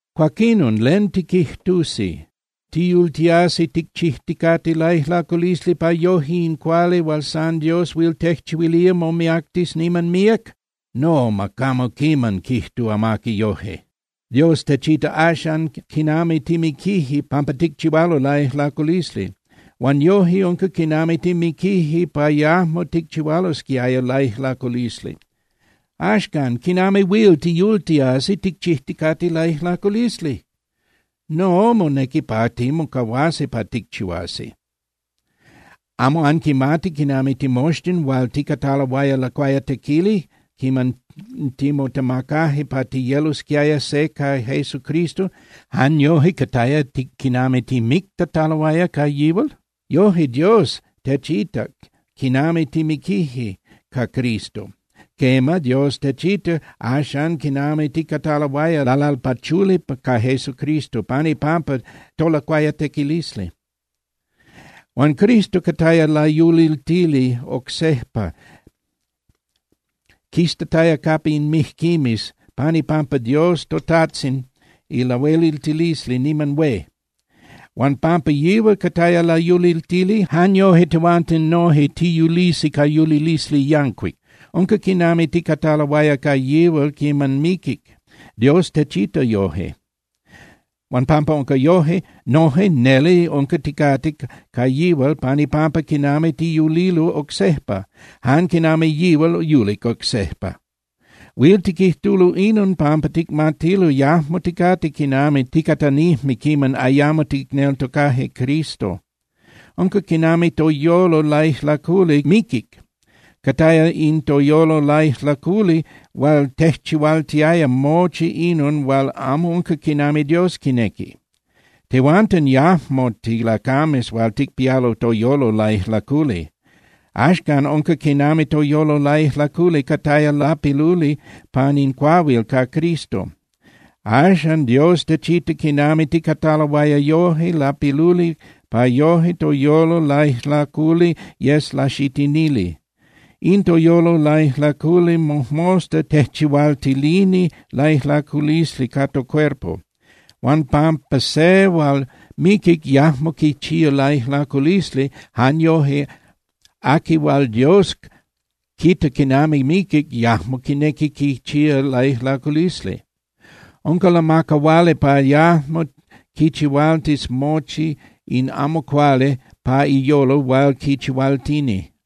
Cuaquinon, ¿len tiquijtusi? ¿Tiyultiasi ticchijticate laijlaculisli pa yoje in cuali hual san Dios huil tejchihuilía momiactis niman míac? ¡No, ma camo quiman quijtu amaqui yoje! Dios techita axan quinami timiquije pampa ticchihualo laijlaculisli, huan yoje unca quinami timiquije pa yajmo ticchihualosquiaya laijlaculisli. Axcan, ¿quinami huil tiyultiasi ticchijticate laijlaculisli? No, monequi pa timocahuasi pa ticchihuasi. ¿Amo anquimati quinami timoxtin hual ticataloaya lacuayatequili quiman timotemacaje pa tiyelosquiaya se ca Jesucristo, jan yoje cataya quinami timictataloaya ca yihual? Yoje Dios techitac quinami timiquije ca Cristo. Quema, Dios techita axan quinami ticataloaya lalalpachuli ca Jesucristo pan ipampa tolacuayatequilisli. Huan Cristo cataya layuliltili oc sejpa quistataya capa in mijquimes pan ipampa Dios toTajtzin ilahueliltilisli niman hué. Huan pampa yihual cataya layuliltili, jan yoje tehuanten noje tiyulisi ca yulilisli yancuic. Unca quinami ticataloaya ca yihual quiman miquic, Dios techita yoje. Huan pampa unca yoje, noje neli unca ticate ca yihual pan ipampa quinami tiyulilo oc sejpa, jan quinami yihual yulic oc sejpa. Huil tiquijtulo inon pampa ticmatilo yajmo ticate quinami ticatanijme quiman ayamo ticneltocaje Cristo. Unca quinami toyolo laijlaculi miquic. Cataya in toyolo laijlaculi hual tejchihualtiaya mochi inon hual amo unca quinami Dios quinequi. Tehuanten yajmo tilacames hual ticpialo toyolo laijlaculi. Axcan unca quinami toyolo laijlaculi cataya lapiluli pan in cuahuil ca Cristo. Axan Dios techita quinami ticataloaya yoje lapiluli pa yoje toyolo laijlaculi yes laxitinili. In toyolo laijlaculi mojmosta tejchihualtilini laijlaculisli ca tocuerpo. Huan pampa se hual miquic yajmo quichía laijlaculisli, jan yoje aqui hual Dios quita quinami miquic yajmo quinequi quichía laijlaculisli. Unca lamacahuali pa yajmo quichihualtis mochi in amo cuali pa iyolo hual quichihualtini.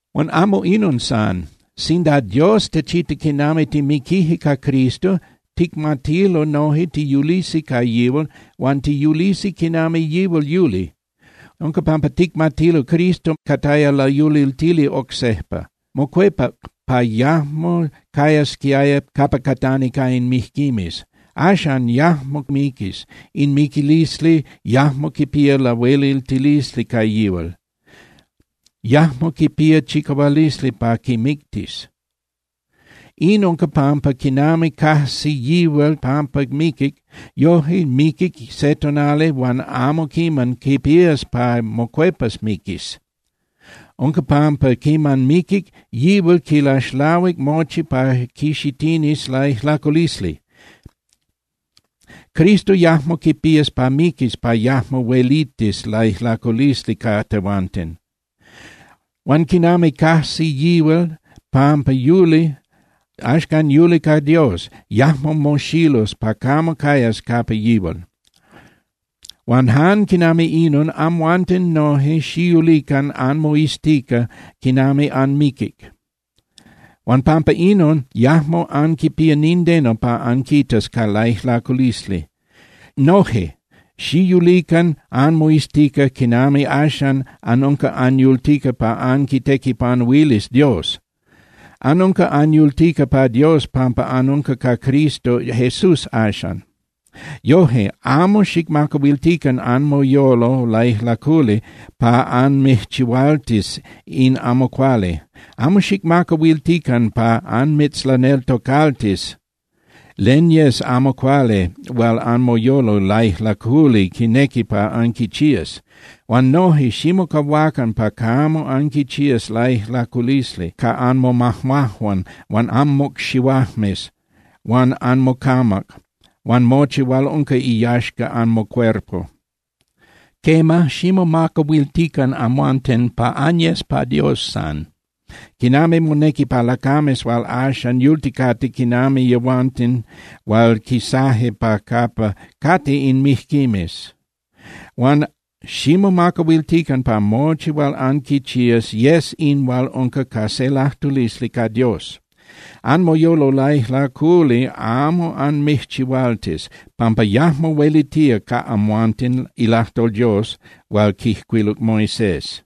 Huan amo inon san. Sinda Dios techita quinami timiquije ca Cristo, ticmatilo noje tiyulisi ca yihual huan tiyulisi quinami yihual yuli. Unca pampa ticmatilo Cristo cataya layuliltili oc sejpa. Mocuepac pa yajmo cayasquiaya capa catani ca in mijquimes. Axan, yajmo miquis, in miquilisli yajmo quipía lahueliltilisli ca yihual, yajmo quipía chicahualisli pa quimictis. In unca pampa quinami cajsi yihual pampa miquic, yoje miquic se tonali huan amo quiman quipías pa mocuepas miquis. Unca pampa quiman miquic, yihual quilaxlahuic mochi pa quixitinis laijlaculisli. Cristo yajmo quipías pa miquis pa yajmo huelitis laijlaculisli ca tehuanten. Huan quinami cajsi yihual pampa yuli, axcan yuli ca Dios, yajmo moxilus pa camo cayas capa yihual. Huan jan quinami inon, amhuanten noje xiyulican anmoiztica quinami anmiquic. Huan pampa inon yajmo anquipía nindeno pa anquitas ca laijlaculisli. Noje xiyulican anmoiztica quinami axan anunca anyultica pa anquitequipanuilis Dios. Anunca anyultica pa Dios pampa anunca ca Cristo Jesús axan. Yoje, amo xicmacahuiltican anmoyolo laijlaculi pa anmijchihualtis in amo cuali. Amo xicmacahuiltican pa anmitzlaneltocaltis len yes amo cuali hual anmoyolo laijlaculi quinequi pa anquichías. Huan noje, ximocahuacan pa camo anquichías laijlaculisli ca anmomajmajuan huan anmocxihuajmes huan anmocamac huan mochi hual unca iyaxca anmocuerpo. Quema, ximomacahuiltican amhuanten pa anyes pa Dios san, quinami monequi pa lacames hual axan yulticate quinami yehuanten hual quisaje pa capa cate in mijquimes. Huan ximomacahuiltican pa mochi hual anquichías yes in hual unca ca se lajtulisli ca Dios. Anmoyolo laijlaculi amo anmijchihualtis, pampa yajmo huelitía ca amhuanten ilajtol Dios hual quijcuiluc Moisés.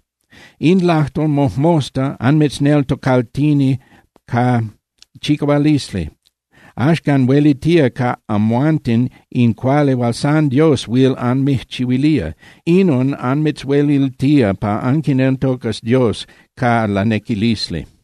In lajtol mojmosta anmitzneltocaltini ca chicahualisli. Axcan huelitía ca amhuanten in cuali hual san Dios huil anmijchihuilía. Inon anmitzhueliltía pa anquineltocas Dios ca lanequilisli.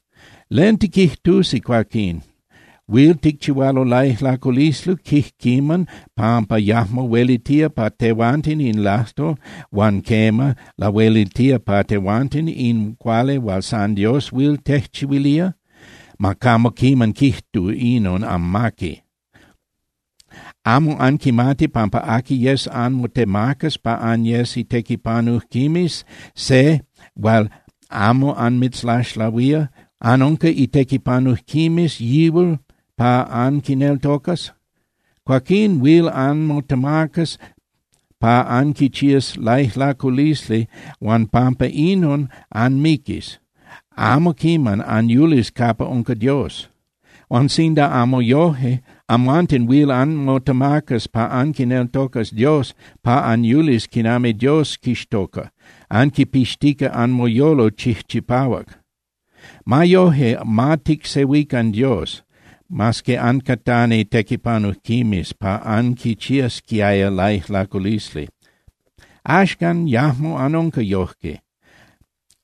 ¿Len tiquijtusi, cuaquín? ¿Huil ticchihualo laijlaculisli quijquiman pampa yajmo huelitía pa tehuanten in lajtol, huan quema, lahueliltía pa tehuanten in cuali hual san Dios huil tejchihuilía? ¡Ma camo quiman quijtu inon amaqui! ¿Amo anquimati pampa aqui yes anmotemacas pa anyes itequipanujquimes se hual amo anmitzlaxlahuía, anunca itequipanujquimes yihual pa anquineltocas? Cuaquín huil anmotemacas pa anquichías laijlaculisli huan pampa inon anmiquis, amo quiman anyulis capa unca Dios. Huan sinda amo yoje, amhuanten huil anmotemacas pa anquineltocas Dios pa anyulis quinami Dios quixtoca, anquipixtica anmoyolo chijchipahuac. Ma yoje, ma ticsehuican Dios. Mas que ancatani tequipanujquimes pa anquichiasquiaya laijlaculisli, axcan yajmo anunca yojque.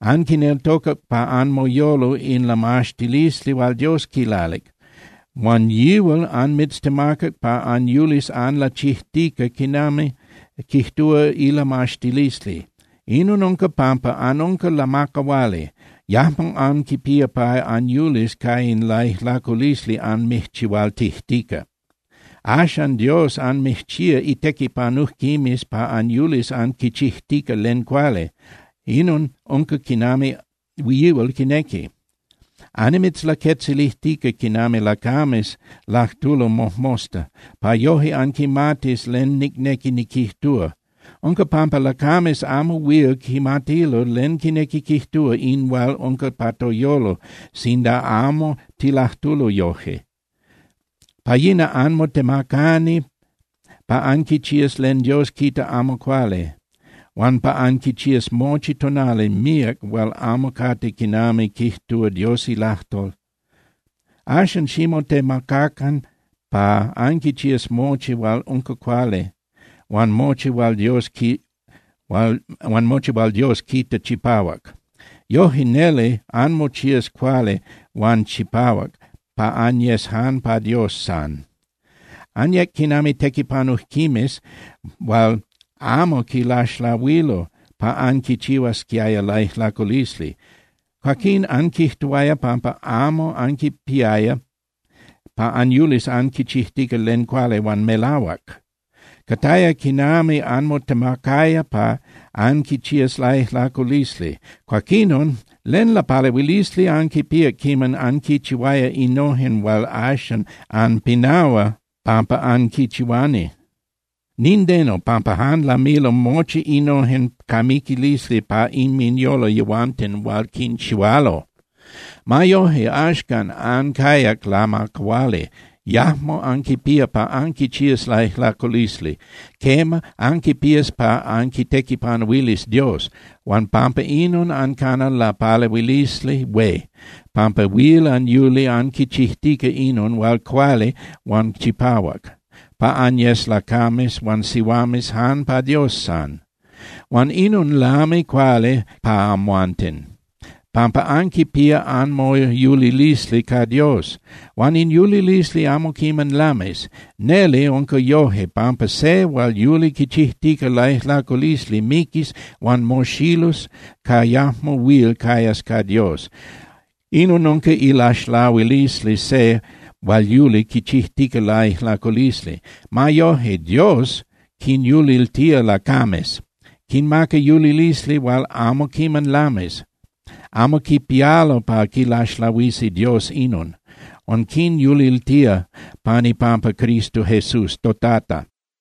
Anquineltocac pa anmoyolo in lamaxtilisli hual Dios quilalic. Huan yihual anmitztemacac pa anyulis anlachijtica quinami quijtúa ilamaxtilisli. Inon unca pampa anunca lamacahuali. Yajmo anquipía pa anyulis ca in laijlaculisli anmijchihualtijtica. Axan Dios anmijchía itequipanujquimes pa anyulis anquichijtica len cuali, inon unca quinami yihual quinequi. Annimitzlaquetzilijtica quinami lacames lajtulo mojmosta, pa yoje anquimatis len nicnequi niquijtúa. Unca pampa lacames amo huil quimatilo len quinequi quijtúa in hual unca pa toyolo sinda amo tilajtulo yoje. Pa yina anmotemacani pa anquichías len Dios quita amo cuali huan pa anquichías mochi tonali míac hual amo cate quinami quijtúa Dios ilajtol. Axan ximotemacacan pa anquichías mochi hual unca cuali huan mochi hual Dios quita chipahuac. Yoje neli anmochías cuali huan chipahuac pa anyes jan pa Dios san. Anyec quinami tequipanujquimes hual amo quilaxlahuilo pa anquichihuasquiaya laijlaculisli. Cuaquín anquijtuaya pampa amo anquipiaya pa anyulis anquichijtica len cuali huan melahuac. Cataya quinami anmotemacaya pa anquichías laijlaculisli. Cuaquinon, ¿len lapalehuilisli anquipíac quiman anquichihuaya innojen hual axan anpinahua pampa anquinchihuani? Nindeno, pampa jan lamilo mochi innojen ca miquilisli pa inminyolo yehuanten hual quinchihualo. Ma yoje, axcan ancayac lamacahuali. Yajmo anquipía pa anquichías laijlaculisli. Quema, anquipías pa anquitequipanuilis Dios. Huan pampa inon ancana lapalehuilisli hué, pampa huil anyuli anquichijtica inon hual cuali huan chipahuac, pa anyes lacames huan sihuames jan pa Dios san. Huan inon lami cuali pa amhuanten, pampa anquipía anmoyulilisli ca Dios. Huan in yulilisli amo quiman lamis. Neli unca yoje, pampa se hual yuli quichijtica laijlaculisli miquis huan moxilus pa yajmo huil cayas ca Dios. Inon unca ilaxlahuilisli se hual yuli quichijtica laijlaculisli. Ma yoje, Dios quinyuliltía lacames, quinmaca yulilisli hual amo quiman lamis. Amo quipialo pa quilaxlahuisi Dios inon. Huan quinyuliltía pan ipampa Cristo Jesús toTata.